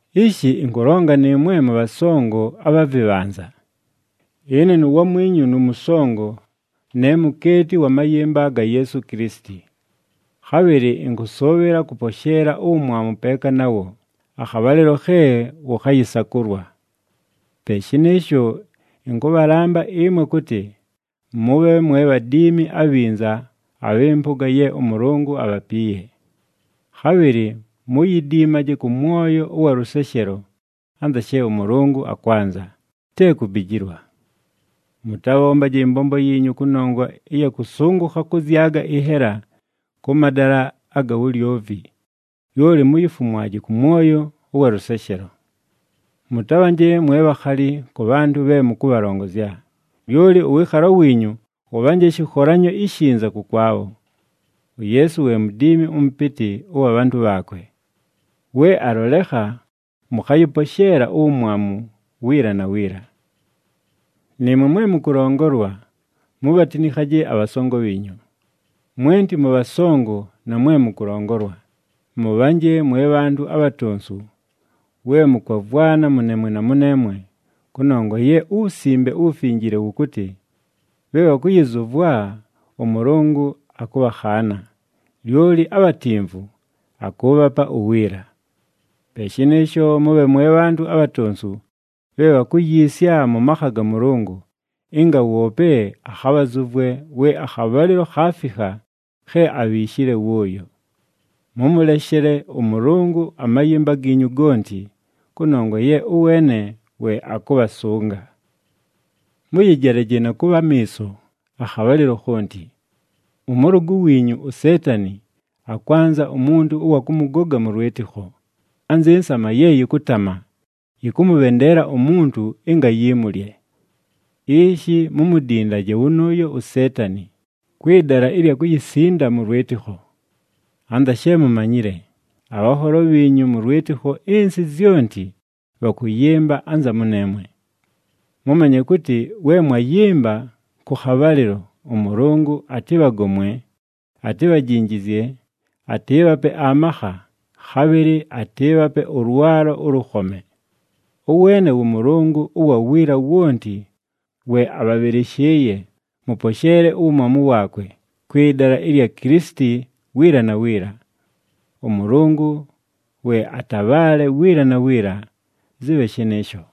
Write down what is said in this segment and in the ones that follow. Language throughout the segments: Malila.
Ishi ɨnkʉlonga nɨɨmwe mʉbhasongo abha vɨbhanza. Ɨne nuwamwinyu nʉmʉsongo, ne mukeeti wa mayɨmba ga Yeesu Kilisiti. Khabhɨlɨ ɨnkʉsʉʉbhɨla kʉposheela uwumwamu peeka nawo, akhabhalɨlo khe wʉkhayɨsakʉlwa. Pe shɨnɨɨsho, ɨnkʉbhalamba ɨmwe kʉtɨ mʉbhe mwe bhadiimi abhinza abhɨ mpʉga ye ʉMʉlʉngʉ abhapiiye. Khabhɨlɨ muyidiimaje kʉ mwoyo ʉwa lʉseshelo anza she ʉMʉlʉngʉ akwanza, te kubijilwa. Mʉtabhombaje ɨmbombo yiinyu kʉnongwa ɨya kʉsʉngʉkha kʉzyaga ɨnhela kʉ madala aga wulyovi, lyoli muyifumwaje kʉ mwoyo ʉwa lʉseshelo. Mʉtabhanje mwe bhakhali kʉ bhantʉ bhe mʉkʉbhalongozya, lyoli ʉwɨɨkhalo wiinyu wʉbhanje shɨkholanyo ishinza kʉkwabho. UYeesu we Mudiimi ʉMʉpɨtɨ ʉwa bhantʉ bhaakwe. We alolekha, mʉkhayɨposheela uwumwamu wiila na wiila. Nɨɨmwe mwe mʉkʉlongolwa, mubhatinikhaje abhasongo bhiinyu. Mwenti mʉbhasongo na mwe mʉkʉlongolwa, mʉbhanje mwe bhantʉ abhatonsu we mʉkwavwana mʉneemwe na mʉneemwe, kʉnongwa ye uWusimbe uWufinjile wʉkʉtɨ, “Bhe bhakʉyɨzʉvwa, ʉMʉlʉngʉ akʉbhakhaana, lyoli abhatimvu, akʉʉbhapa uwiila.” Pe shɨnɨɨsho mʉbhe mwe bhantʉ abhatonsu bhe bhakuyiisya mʉ makha ga Mʉlʉngʉ, ɨnga woope akhabhazʉvwe we akhabhalɨlo khaafikha khe abhiishile wʉʉyo. Mʉmʉleshele ʉMʉlʉngʉ amayɨmba giinyu gonti, kʉnongwa ye ʉweene we akʉbhasʉnga. Mʉyɨjelaje na kʉbha amiiso akhabhalɨlo khonti. Ʉmʉlʉgʉ wiinyu uSeetani akwanza umuntu ʉwa kʉmʉgoga mʉ lwɨtɨkho, anzɨ nsama ye yɨkʉtama, yɨkʉmʉbhendeela umuntu ɨnga yimulye. Ishi mumudindaje wʉnʉʉyo uSeetani kwɨ dala ɨlya kuyisinda mʉ lwɨtɨkho. Anza she mumanyile, abhanholo bhiinyu mʉ lwɨtɨkho ɨnsɨ zyonti bhakʉyɨmba anza mʉneemwe. Mʉmanye kʉtɨ we mwayɨmba kʉ khabhalɨlo, ʉMʉlʉngʉ atɨbhagomwe, atibhajinjizye, atɨɨbhape amakha, khabhɨlɨ atɨɨbhape ʉlwalo ʉlʉkhome. Ʉweene wʉ Mʉlʉngʉ ʉwa wiila wonti we abhabhɨlɨshɨɨye mʉposheele uwumwamu waakwe kwɨ dala ɨlya Kilisiti wiila na wiila. ɄMʉlʉngʉ we atabhaale wiila na wiila! Zɨbhe shɨnɨɨsho.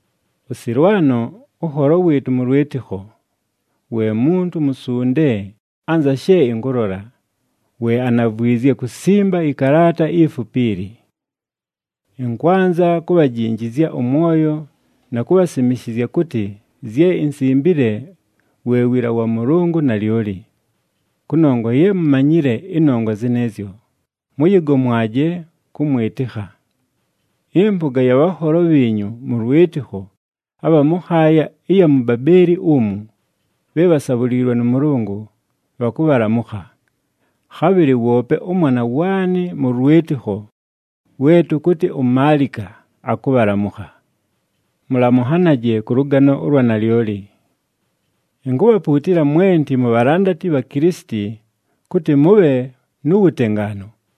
ɄSɨlwano, ʉnholo wɨɨtʉ mʉ lwɨtɨkho, we muntu musunde anza she ɨnkʉlola, we anavwizye kusimba ɨkalaata ifupi ili. Ɨnkwanza kubhajinjizya ʉmwoyo na kubhasimishizya kʉtɨ zye insimbile we wiila wa Mʉlʉngʉ nalyoli. Kʉnongwa ye mumanyile ɨnongwa zɨnɨɨzyo, mʉyɨgomwaje kʉmwɨtɨkha. Ɨmpʉga ya bhanholo bhiinyu mʉ lwɨtɨkho abha mʉ nhaaya ɨya mu Babeeli umu, bhe bhasabhuliilwe nʉ Mʉlʉngʉ, bhakʉbhalamʉkha. Khabhɨlɨ woope ʉmwana waanɨ mʉ lwɨtɨkho we tʉkʉtɨ uMaalika akʉbhalamʉkha. Mʉlamʉnhanaje kʉ lʉgano ʉlwa nalyoli. Inkubhapuutila mwenti mubhalandati bha Kilisiti kʉtɨ mʉbhe nu wutengaanu.